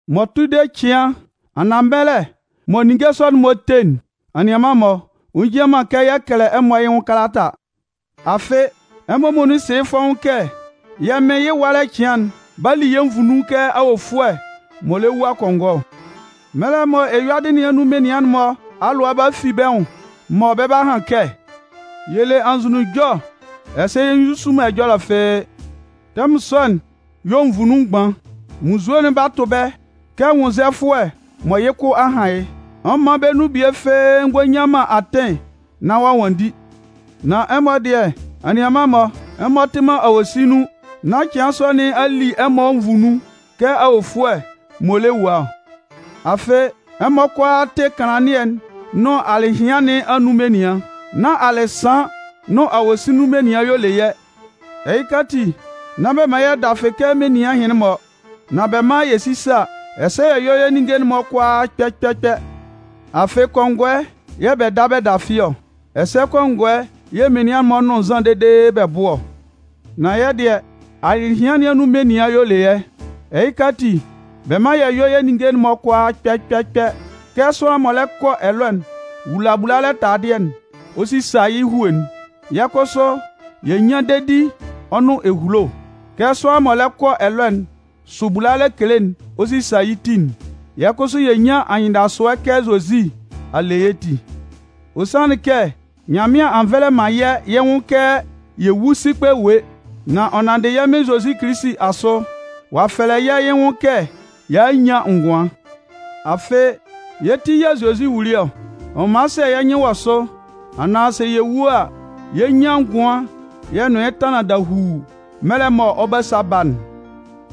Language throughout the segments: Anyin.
M'ɔ tʋ de cɩan anaan mɛlɛ mɔ ninnge sɔ'n-mɔ 'te'n, anianman-mɔ, ɔ njian man kɛ yɛ kɛlɛ ɛmɔ yɩ́ nwʋn kalata. Afɩ, ɛmɔ muonun sɩ yɩ́ fɔ́ʋ́n kɛ yɛ́ Mɩn yɩ́ ɛwalɛ cɩan'n 'ba li yɛ́ nvu nun kɛ awofʋɛ m'ɔ lɛ wua kɔngɔɛ ɔ. Mɛlɛ mɔ eyuadɩ nɩn anun menian'n-mɔ alʋa 'ba fi bɛ́ nwʋn, mɔ bɛ 'ba han kɛ: “Yɛ le anzʋnunjɔ, ɛsɛ yɛ nzusu man ɛjɔlɛ fɩ́ɩ́”, tɛmʋn sɔ'n yɛ̂ nvu nun mgban, munnzue'n 'ba tʋ bɛ́ kɛ nwʋnnzɛfʋɛ mɔ yɩ́ kʋ kɔ han yɩ́. Ɔ man bɛ́ nun bie fɩ́ɩ́ ngɔ nnyan man atɩn nán ɔ'a nwanndi. Nan ɛmɔ dɩɛ, anianman-mɔ, ɛmɔ tɩ man awosin nun, nán cɩan sɔ nɩn a li ɛmɔ nvu nun kɛ awofʋɛ m'ɔ lɛ wua ɔ. Afɩ, ɛmɔ kʋalaa tɩ kanlannɩɛ'n nʋn alɩhɩan nɩn anun menian. Nán alɩsan nʋn awosin nun menian y'ɔ le yɛ́. Ɛhɩka ati, nán bɛ man yɛ́ dafɩ kɛ menian ɛhɩnlɩn-mɔ, nan bɛ mán yɛ sísa, ɛsɛ yɛ yɔ́ yɛ́ ninnge'n-mɔ kʋalaa kpɛ kpɛ kpɛ. Afɩ kɔngɔɛ yɛ̂ bɛ da bɛ dafɩ ɔ, ɛsɛ kɔngɔɛ yɛ̂ menian'n-mɔ nʋn nzan dede bɛ bʋ ɔ. Nan yɛ́ dɩɛ, alɩhɩan nɩn anun menian y'ɔ le yɛ́. Ɛhɩka ati, bɛ mán yɛ yɔ́ yɛ́ ninnge'n-mɔ kʋalaa kpɛ kpɛ kpɛ. Kɛ sʋanlan m'ɔ lɛ kɔ ɛlɔɛ'n wula bulalɛ taladɩɛ'n ɔ sisa yɩ́ hue'n, yɛ́ kʋsʋ yɛ nyán dedi ɔ nʋn ehulo. Kɛ sʋanlan mɔ lɛ kɔ ɛlɔɛ'n sʋ bulalɛ kele'n ɔ sisa yɩ́ ti'n, yɛ́ kʋsʋ yɛ nyán anyɩndasʋɛ kɛ Zozi a le yɛ́ ti. Ɔ sanlɩn kɛ Nyanmɩan a nvɛlɛ man yɛ́ yɩ́ nwʋn kɛ yɛ wú sikpɛ ewue, nan ɔ nanndɩ yɛ́ Mɩn Zozi Kilisi asʋ, ɔ'a fɛlɛ yɛ́ yɩ́ nwʋn kɛ y'a a nyan ngʋan. Afɩ, yɛ́ ti yɛ̂ Zozi wuli ɔ. Ɔ man sɛ yɛ́ nyɩn wɔ sʋ, anaan sɛ yɛ wu a, yɛ 'nyan ngʋan yɛ nʋn yɩ́ tanlan dahuu mɛlɛ mɔ ɔ 'ba sa ba'n.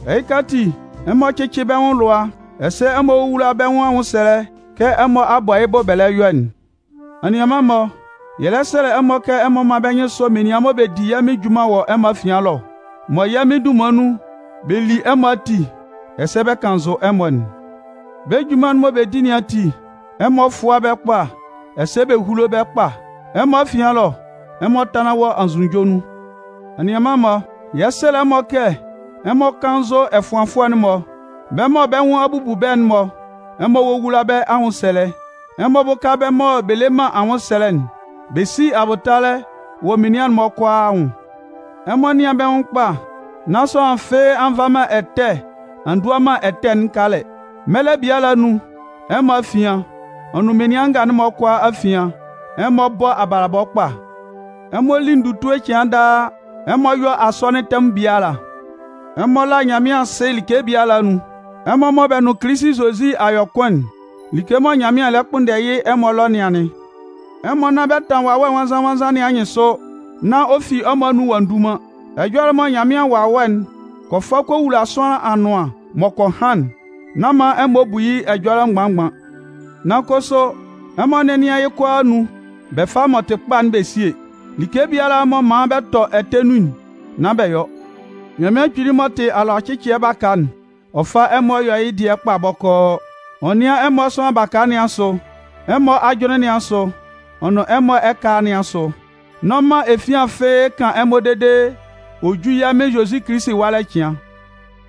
Ɛhɩka ati, ɛmɔ cɩ́cɩ bɛ́ nwʋn alʋa, ɛsɛ ɛmɔ wówula bɛ́ nwʋn anwʋnsɛlɛ kɛ ɛmɔ a bɔ yɩ́ bʋ bɛ lɛ yɔ'n. Anianman-mɔ, yɛ lɛ sɛlɛ ɛmɔ kɛ ɛmɔ mán bɛ́ nyɩn sɔ́ menian mɔ bɛ di yɛ́ Mɩn junman wɔ ɛmɔ afian ɛlɔ, mɔ yɛ́ Mɩn dunman nun, bɛ li ɛmɔ ati, ɛsɛ bɛ kannzʋ ɛmɔ'n. Bɛ́ junman'n mɔ bɛ di nɩn ati, ɛmɔ fʋ́a bɛ́ kpa, ɛsɛ bɛ húlo bɛ́ kpa. Ɛmɔ afian ɛlɔ, ɛmɔ tánlan wɔ anzʋnunjɔ nun. Anianman-mɔ, yɛ 'sɛlɛ ɛmɔ kɛ, ɛmɔ kánnzʋ ɛfʋanfʋɛ'n-mɔ. Bɛ́ mɔ bɛ nwʋn a bubu bɛ́'n-mɔ, ɛmɔ wówula bɛ́ anwʋnsɛlɛ, ɛmɔ bʋ́ka bɛ́ mɔ bɛ le man anwʋnsɛlɛ'n, bɛ sí abʋtalɛ wɔ menian'n-mɔ kʋalaa anwʋn. Ɛmɔ nɩ́an bɛ́ nwʋn kpa, nán sʋanlan fɩ́ɩ́ a nva man ɛtɛ a ndua man ɛtɛ'n kalɛ. Mɛlɛ biala anun, ɛmɔ afian, ɔ nʋn menian nga'n-mɔ kʋalaa afian, ɛmɔ bɔ́ abalabɔ kpa. Ɛmɔ lí ndutue cɩan daa. Ɛmɔ yɔ́ asɔnɩn tɛmʋn biala. Ɛmɔ lá Nyanmɩan asɩ like biala anun. Ɛmɔ mɔ bɛ nʋn Kilisi Zozi a yɔ kʋn'n, like mɔ Nyanmɩan lɛ kpʋnndɛ yɩ́ ɛmɔ ɛlɔ nɩn anɩn. Ɛmɔ nán bɛ tan Wawɛ Nwannzan-nwannzan nɩn anyɩnsʋ, nán ɔ fi ɛmɔ anun ɔ'a ndu man. Ɛjɔlɛ mɔ Nyanmɩan Wawɛ'n kɔ fa kɔ wula sʋanlan anʋan m'ɔ kɔ han'n, nán man ɛmɔ bu yɩ́ ɛjɔlɛ mgban-mgban. Nan kʋsʋ, ɛmɔ nɛ́nɩan yɩ́ kʋalaa anun, bɛ fá m'ɔ tɩ kpa'n bɛ síe. Like biala m'ɔ man bɛ tɔ ɛtɛ nun'n, nán bɛ yɔ. Nyanmɩan Kpili m'ɔ tɩ alʋacɩcɩɛ baka'n, ɔ fá ɛmɔ yɔ́ yɩ́ dɩɛ kpa bɔkɔɔ. Ɔ nɩ́an ɛmɔ sʋanlan baka nɩn asʋ, ɛmɔ ajʋnlɩn nɩn asʋ, ɔ nʋn ɛmɔ ɛkala nɩn asʋ. N'ɔ man efian fɩ́ɩ́ kan ɛmɔ dede ɔ jú yɛ́ Mɩn Zozi Kilisi ɛwalɛ cɩan.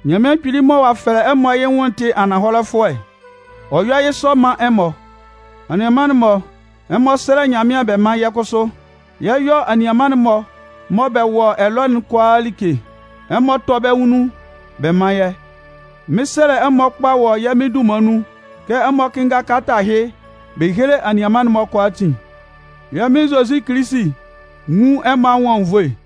Nyanmɩan Kpili mɔ ɔ'a fɛlɛ ɛmɔ yɩ́ nwʋn'n tɩ ananhɔlɛfʋɛ, ɔ 'yɔ yɩ́ sɔ man ɛmɔ. Anianman-mɔ, ɛmɔ sɛ́lɛ Nyanmɩan bɛ mán yɛ́ kʋsʋ. Yɛ 'yɔ anianman'n-mɔ mɔ bɛ wɔ ɛlɔ'n kʋalaa like, ɛmɔ tɔ́ bɛ́ nun bɛ́ man yɛ́. Mɩn 'sɛlɛ ɛmɔ kpa wɔ yɛ́ Mɩn dunman nun kɛ ɛmɔ kɩ́nnga kalata ɛhɩ bɛ héle anianman'n-mɔ kʋalaatin. Yɛ́ Mɩn Zozi Kilisi nwún ɛmɔ anwʋn anwunnvoe.